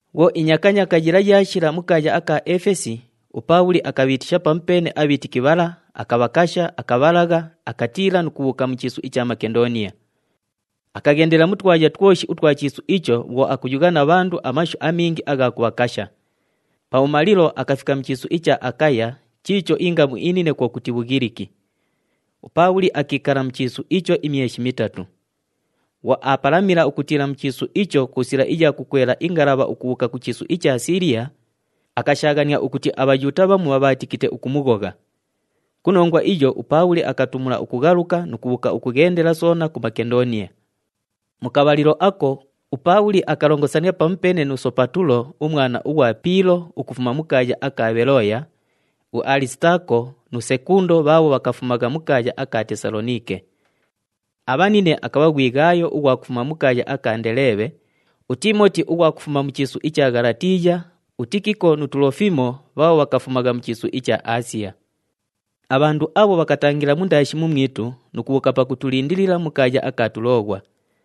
Bhwo inyakanyaaka yila yaashila mu kaaya aka Efesi, uPaabhuli akabhiitisha pamupeene abhiitiki bhala, akabhakasha, akabhalagha, akatiila nu kubhuuka mu chiisu icha Makendooniya. Akaghendela mu twaya twoshi utwa chiisu icho bhwo akuyugha na bhandu amashu amingi agha kubhakasha. Pabhumalilo akafika mu chiisu icha Akaya chiicho ingamu inine kwo kuti, Bhughiliki. UPaabhuli akiikala mu chiisu icho imyeshi mitatu. Bhwo aapalamila ukutiila mu chiisu icho ku sila iya kukwela ingalabha ukubhuuka ku chiisu icha Siiliya, akashaaghania ukuti aBhayuuta bhamu bhabhaatikite ukumughogha. Ku nongwa iyo, uPaabhuli akatumula ukughaluka nu kubhuuka ukughendela soona ku Makendooniya. Mu kabhalilo ako, uPaabhuli akalongosania pamupeene nu Sopatulo umwana ughwa Piilo ukufuma mu kaaya aka Bhelooya, uAlisitaako nu Sekundo bhaabho bhakafumagha mu kaaya aka Tesaloniike. Abhanine akabha ghwi Ghaayo ughwa kufuma mu kaaya aka Ndeleebhe, uTiimoti ughwa kufuma mu chiisu icha Ghalatiiya, uTikiko nu Tulofimo bhaabho bhakafumagha mu chiisu icha Aasiya. Abhandu abho bhakatangila mundaashi mumwitu nu kubhuuka pakutulindilila mu kaaya aka Tulooghwa.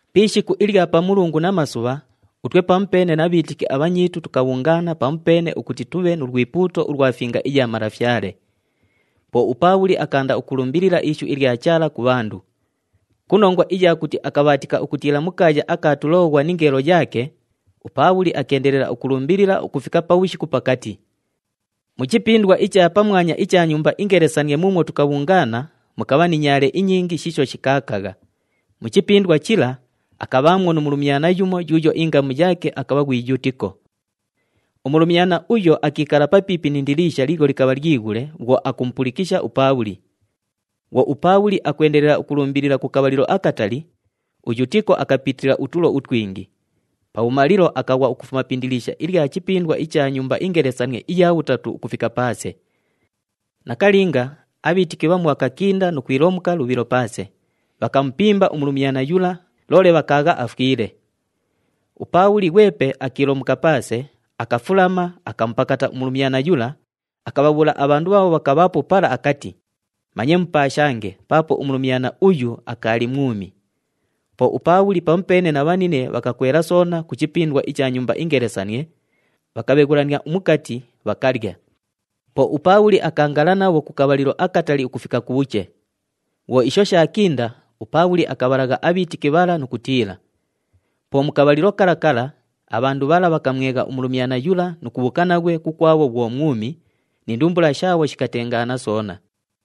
Pi ishiku ilya Pamulungu namasubha, utwe pamupeene na bhiitiki abhanyiitu tukabhungaana pamupeene ukuti tubhe nu lwipuuto ulwa Finga iya Malafyale. Po uPaabhuli akaanda ukulumbilila ishu ilya Chaala ku bhandu. Ku nongwa iya kuti akabhaatika ukutiila mu kaaya aka Tulooghwa ningeelo yaake, uPaabhuli akeendelela ukulumbilila ukufika pabhushiku pakati. Mu chipindwa icha pamwanya icha nyumba ingelesanie muumwo tukabhungaana mukabha ni nyaale inyingi shiisho shikaakagha. Mu chipindwa chila, akabhaamwo nu mulumyana yumo yuuyo ingamu yaake akabha ghwi Yutiko. Umulumyana uyo akiikala papiipi ni indiliisha liilyo likabha lyighule bhwo akumupulikisha uPaabhuli. Bhwo uPaabhuli akwendelela ukulumbilila ku kabhalilo akatali, uYutiko akapitila utulo utwingi. Pabhumalilo, akaghwa ukufuma pi indiliisha ilya chipindwa icha nyumba ingelesanie iya bhutatu ukufika paase. Nakalinga, abhiitiki bhamu bhakakinda nu kwilomuka lubhilo paase, bhakamupimba umulumyana yula, loole bhakaagha afwile. UPaabhuli ghwepe akiilomuka paase, akafulama, akamupakata umulumyana yula, akabhabhuula abhandu bhaabho bhakabhaapo pala akati, “Manye mupaashange paapo umulumyana uyu akaali mwumi.” Po uPaabhuli pamupeene na bhanine bhakakwela soona ku chipindwa icha nyumba ingelesanie, bhakabheghulania umukati, bhakalya. Po uPaabhuli akaangala nabho ku kabhalilo akatali ukufika kubhuche. Bhwo isho shaakinda, uPaabhuli akabhalagha abhiitiki bhala nu kutiila. Po mu kabhalilo kala kala, abhandu bhala bhakamwegha umulumyana yula nu kubhuuka naghwe kukwabho bhwo mwumi, ni ndumbula shaabho shikatengaana soona.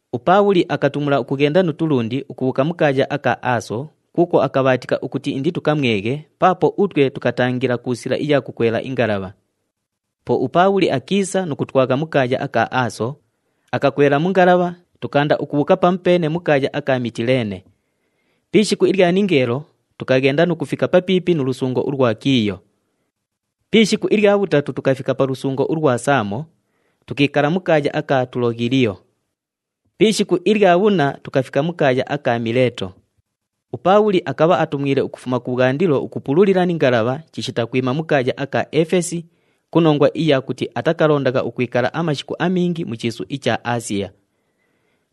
UPaabhuli akatumula ukughenda nu tulundi ukubhuuka mu kaaya aka Aaso kuukwo akabhaatika ukuti inditukamweghe paapo utwe tukatangila ku sila iya kukwela ingalabha. Po uPaabhuli akiisa nu kutwagha mu kaaya aka Aaso, akakwela mu ngalabha, tukaanda ukubhuuka pamupeene mu kaaya aka Mitileene. Pi ishiku ilya ningeelo tukaghenda nu kufika papiipi nu lusungo ulwa Kiiyo. Pi ishiku ilya bhutatu tukafika pa lusungo ulwa Saamo, tukiikala mu kaaya aka Tuloghiliyo. Pi ishiku ilya bhunna tukafika mu kaaya aka Mileeto. UPaabhuli akabha atumwile ukufuma kubhwandilo ukupululila ni ngalabha chishita kwima mu kaaya aka Efesi ku nongwa iya kuti atakalondagha ukwikala amashiku amingi mu chiisu icha Aasiya.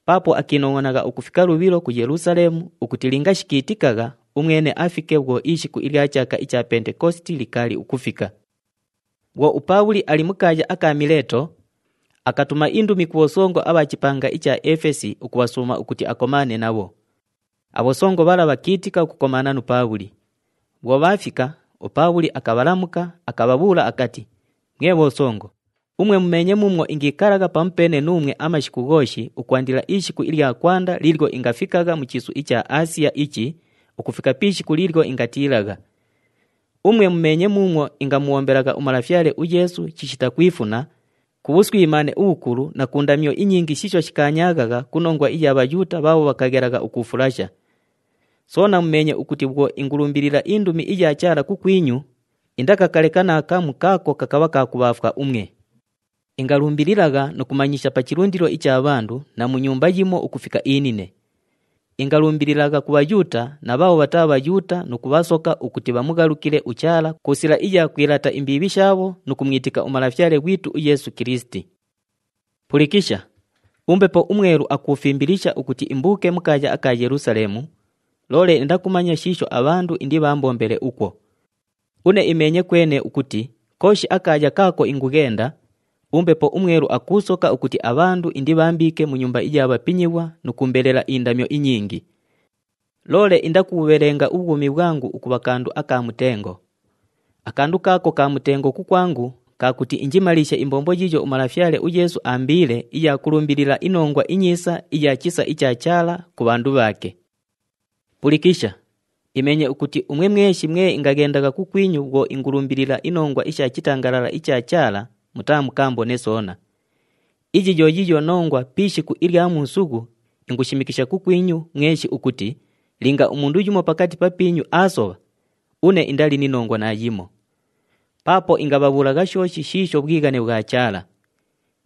Paapo akiinongʼonagha ukufika lubhilo ku Yelusaleemu ukuti linga shikiitikagha umwene afike bhwo ishiku ilya chaaka icha Pentekositi likaali ukufika. Bhwo uPaabhuli ali mu kaaya aka Mileeto, akatuma indumi ku bhosongo abha chipanga icha Efesi ukubhasuuma ukuti akomaane nabho. Abhosongo bhala bhakiitika ukukomaana nu Paabhuli. Bhwo bhaafika, uPaabhuli akabhalamuka, akabhabhuula akati, “Mwe bhosongo, umwe mumeenye muumwo ingiikalagha pamupeene nuumwe amashiku ghooshi ukwandila ishiku ilya kwanda liilyo ingafikagha mu chiisu icha Aasiya ichi ukufika pi ishiku liilyo ingatiilagha. Umwe mumeenye muumwo ingamubhombelagha uMalafyale uYeesu chishita kwifuna, ku bhuswimaane ubhukulu na ku ndamyo inyingi shiisho shikaanyaaghagha ku nongwa iya Bhayuuta bhaabho bhakaghelagha ukuufulasha. Soona mumeenye ukuti bhwo ingulumbilila indumi iya Chaala kukwinyu, indakakaleka naakamu kaako kakabha ka kubhaafwa umwe. Ingalumbililagha nu kumanyisha pa chilundilo icha bhandu na mu nyumba yimo ukufika inine. Ingalumbililagha ku Bhayuuta na bhaabho bhataa Bhayuuta nu kubhasoka ukuti bhamughalukile uChaala ku sila iya kwilaata imbiibhi shaabho nu kumwitika uMalafyale ghwitu uYeesu Kilisiti. “Pulikisha! UMbepo uMwelu akuufimbilisha ukuti imbuuke mu kaaya aka Yelusaleemu, loole indakumanya shiisho abhandu indibhaambombele ukwo. Une imeenye kwene ukuti kooshi akaaya kaako ingughenda, uMbepo uMwelu akuusoka ukuti abhandu indibhambiike mu nyumba iya bhapinyighwa nu kuumbelela indamyo inyingi. Loole indakubhubhelenga ubhwumi bhwangu ukubha kandu aka mutengo. Akandu kaako ka mutengo kukwangu ka kuti injimaliishe imbombo yiiyo uMalafyale uYeesu aambiile iya kulumbilila iNongwa iNyiisa iya chisa icha Chaala ku bhandu bhaake. “Pulikisha! Imeenye ukuti umwe mweshi mwe ingaghendagha kukwinyu bhwo ingulumbilila inongwa isha chitangalala icha Chaala mutaamukaambone soona. Iyi yo yiiyo nongwa pi ishiku ilya muusughu ingushimikisha kukwinyu mweshi ukuti linga umundu yumo pakati papiinyu aasobha, une indali ni nongwa naayimo. Paapo ingabhabhuulagha shooshi shiisho bhwighane bhwa Chaala.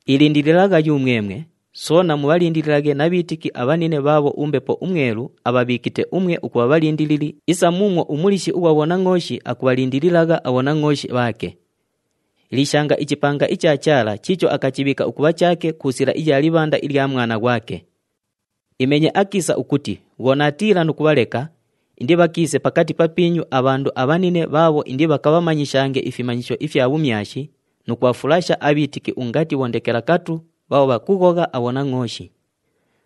Ilindililagha yumwemwe, soona mubhalindililaghe na bhiitiki abhanine bhaabho uMbepo uMwelu abhabhiikite umwe ukubha bhalindilili isa muumwo umuliishi ughwa bhonangʼooshi akubhalindililagha abhonangʼooshi bhaake. Liishanga ichipanga icha Chaala chiicho akachibhiika ukubha chaake ku sila iya libhanda ilya Mwana ghwake. Imeenye akiisa ukuti bhwo naatiila nu kubhaleka, indibhakiise pakati papiinyu abhandu abhanine bhaabho indibhakamanyishange ifimanyisho ifya bhumyashi nu kubhafulasha abhiitiki ungati bhondekelakatu bhaabho bhakughogha abhonangʼooshi.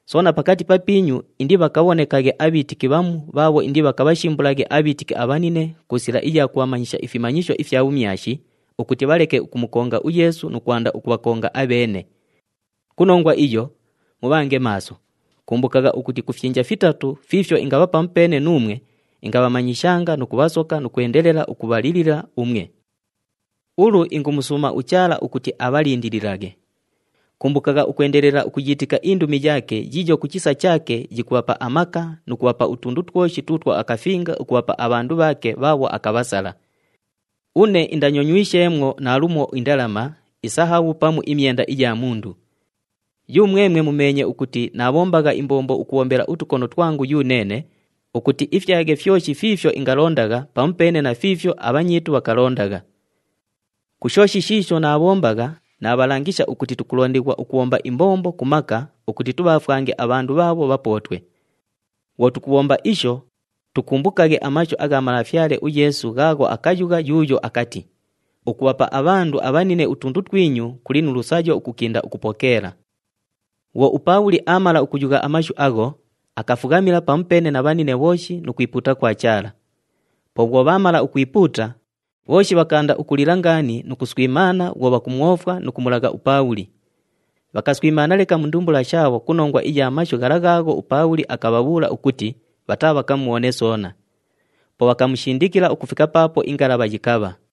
Soona pakati papiinyu indibhakabhonekaghe abhiitiki bhamu bhaabho indibhakabhashimbulaghe abhiitiki abhanine ku sila iya kubhamanyisha ifimanyisho ifya bhumyashi ukuti bhaleke ukumukonga uYeesu nu kwanda ukubhakonga abheene. Ku nongwa iyo, mubhange maaso! Kumbukagha ukuti ku fyinja fitatu fiifyo ingabha pamupeene nuumwe ingabhamanyishanga nu kubhasoka nu kwendelela ukubhalilila umwe. “Ulu ingumusuuma uChaala ukuti abhalindililaghe. Kumbukagha ukwendelela ukuyiitika indumi yaake yiiyo ku chisa chaake yikubhapa amaka nu kubhapa utundu twoshi tuutwo akafinga ukubhapa abhandu bhaake bhaabho akabhasala. Une indanyonywisheemwo naalumo indalama, isahabhu pamu imyenda iya mundu. Yumwemwe mumeenye ukuti naabhombagha imbombo ukubhombela utukono twangu yuneene ukuti ifyaghe fyoshi fiifyo ingalondagha pamupeene na fiifyo abhanyiitu bhakalondagha. Ku shooshi shiisho naabhombagha, naabhalangisha ukuti tukulondighwa ukubhomba imbombo ku maka ukuti tubhaafwange abhandu bhaabho bhapootwe. Bhwo tukubhomba isho, tukumbukaghe amashu agha Malafyale uYeesu ghaagho akayugha yuuyo akati, ‘Ukubhapa abhandu abhanine utundu twinyu kuli nu lusayo ukukinda ukupokeela.’” Bhwo uPaabhuli aamala ukuyugha amashu agho, akafughamila pamupeene na bhanine bhooshi nu kwipuuta kwa Chaala. Po bhwo bhaamala ukwipuuta, bhooshi bhakaanda ukulila ngaani nu kuswimaana bhwo bhakumwofwa nu kumulagha uPaabhuli. Bhakaswimaana leka mu ndumbula shaabho ku nongwa iya mashu ghala ghaagho uPaabhuli akabhabhuula ukuti bhataabhakamubhone soona. Po bhakamushindikila ukufika paapo ingalabha yikabha.